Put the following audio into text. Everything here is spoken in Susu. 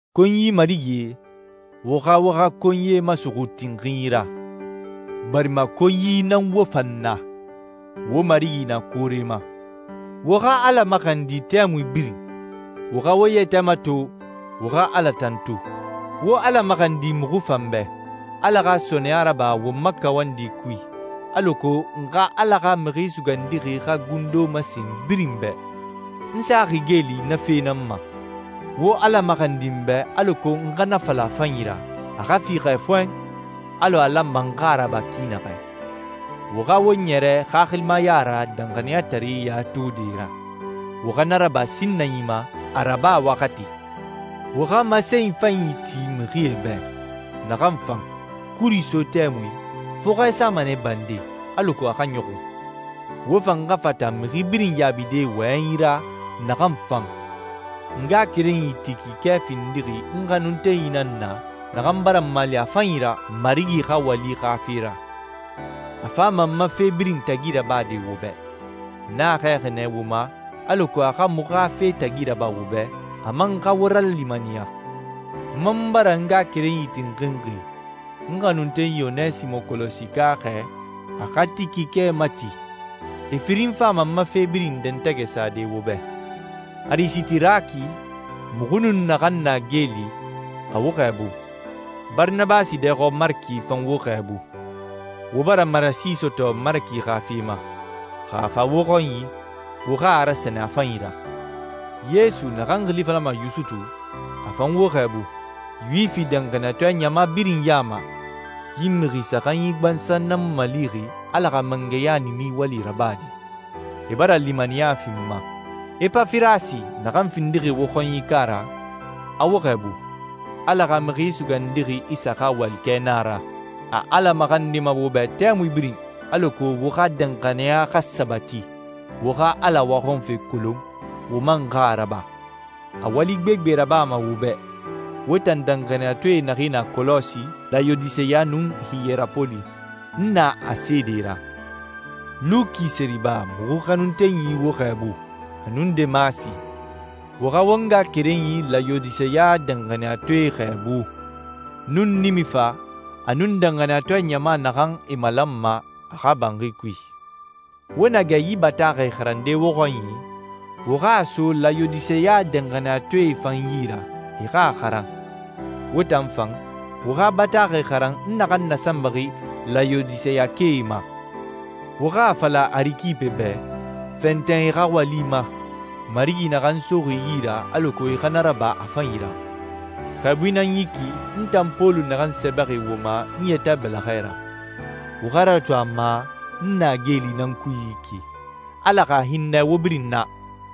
Konyi marigie, wo xa wo xa konyie masuxu tinxinyi ra, barima konyi nan wo fan na. Wo Marigi na koore ma. Wo xa Ala maxandi tɛmui birin. Wo xa wo yɛtɛ mato, wo xa Ala tantu. Wo Ala maxandi muxu fan bɛ. Ala xa sɔɔnɛya raba won ma kawandi kui, alako n xa Ala xa Mixi Sugandixi xa gundo masen birin bɛ. N saxi geeli na fe nan ma. Wo Ala maxandi n bɛ alako n xa na fala a fanyi ra, a xa fiixɛ fɔɛn, alɔ a lanma n xa a raba ki naxɛ. Wo xa wo ɲɛrɛ xaxilimaya ra danxaniyataree ya tode ra. Wo xa na raba sinnanyi ma a raba waxati. Wo xa masenyi fanyi ti mixie bɛ, naxan fan. Kuri so tɛmui, fɔxɛ sama nɛ bande, alako a xa ɲɔxun. Wo fan xa fata mixi birin yaabide wɔyɛnyi ra naxan fan. N ngaxakerenyi Tikike findixi n xanuntenyi nan na naxan bara n mali a fanyi ra Marigi xa wali xa fe ra. A fama n ma fe birin tagi rabade wo bɛ. N a xɛɛxi nɛ wo ma alako a xa muxu xa fe tagi raba wo bɛ, a man xa wo ralimaniya. N man bara n ngaxakerenyi tinxinxi, n xanuntenyi Onesimo Kɔlɔsika xɛɛ a xa Tikike mati. E firinyi fama n ma fe birin dɛntɛgɛ sade wo bɛ. Arisitaraki, muxu nun naxan na geeli, a wo xɛɛbu. Baranabasi dɛɛxɔ Maraki fan wo xɛɛbu. Wo bara marasi sɔtɔ Maraki xa fe ma. Xa a fa wo xɔnyi, wo xa a rasɛnɛ a fanyi ra. Yesu, naxan xili falama Yusutu, a fan wo xɛɛbu. Yuwifi danxaniyatɔɛ ɲama birin ya ma, yi mixi saxanyi gbansan nan n malixi Ala xa mangɛya niini wali rabade. E bara limaniya fi n ma. Epafirasi, naxan findixi wo xɔnyika ra, a wo xɛɛbu. Ala xa Mixi Sugandixi Isa xa walikɛ nan a ra. A Ala maxandima wo bɛ tɛmui birin alako wo xa danxaniya xa sabati, wo xa Ala waxɔnfe kolon, wo man xa a raba. A wali gbegbe rabama wo bɛ, wo tan danxaniyatɔɛ naxee na Kɔlɔsi, Layodiseya, nun Hiyerapoli. N na a seede ra. Luki seriba, muxu xanuntenyi wo xɛɛbu, a nun Demasi. Wo xa won ngaxakerenyi Layodiseya danxaniyatɔɛe xɛɛbu, nun Nimifa, a nun danxaniyatɔɛ ɲama naxan e malanma a xa banxi kui. Wo na gɛ yi bataaxɛ xarande wo xɔnyi, wo xa a so Layodiseya danxaniyatɔɛe fan yi ra, e xa a xaran. Wo tan fan, wo xa bataaxɛ xaran n naxan nasanbaxi Layodiseyakae ma. Wo xa a fala Arikipe bɛ, «Fɛntɛn i xa wali ma, Marigi naxan soxi i yi ra alako i xa na raba a fanyi ra.» Xɛɛbui nan yi ki, n tan Pɔlu naxan sɛbɛxi wo ma n yɛtɛ bɛlɛxɛ ra. Wo xa ratu a ma n na geeli nan kui yi ki. Ala xa hinnɛ wo birin na.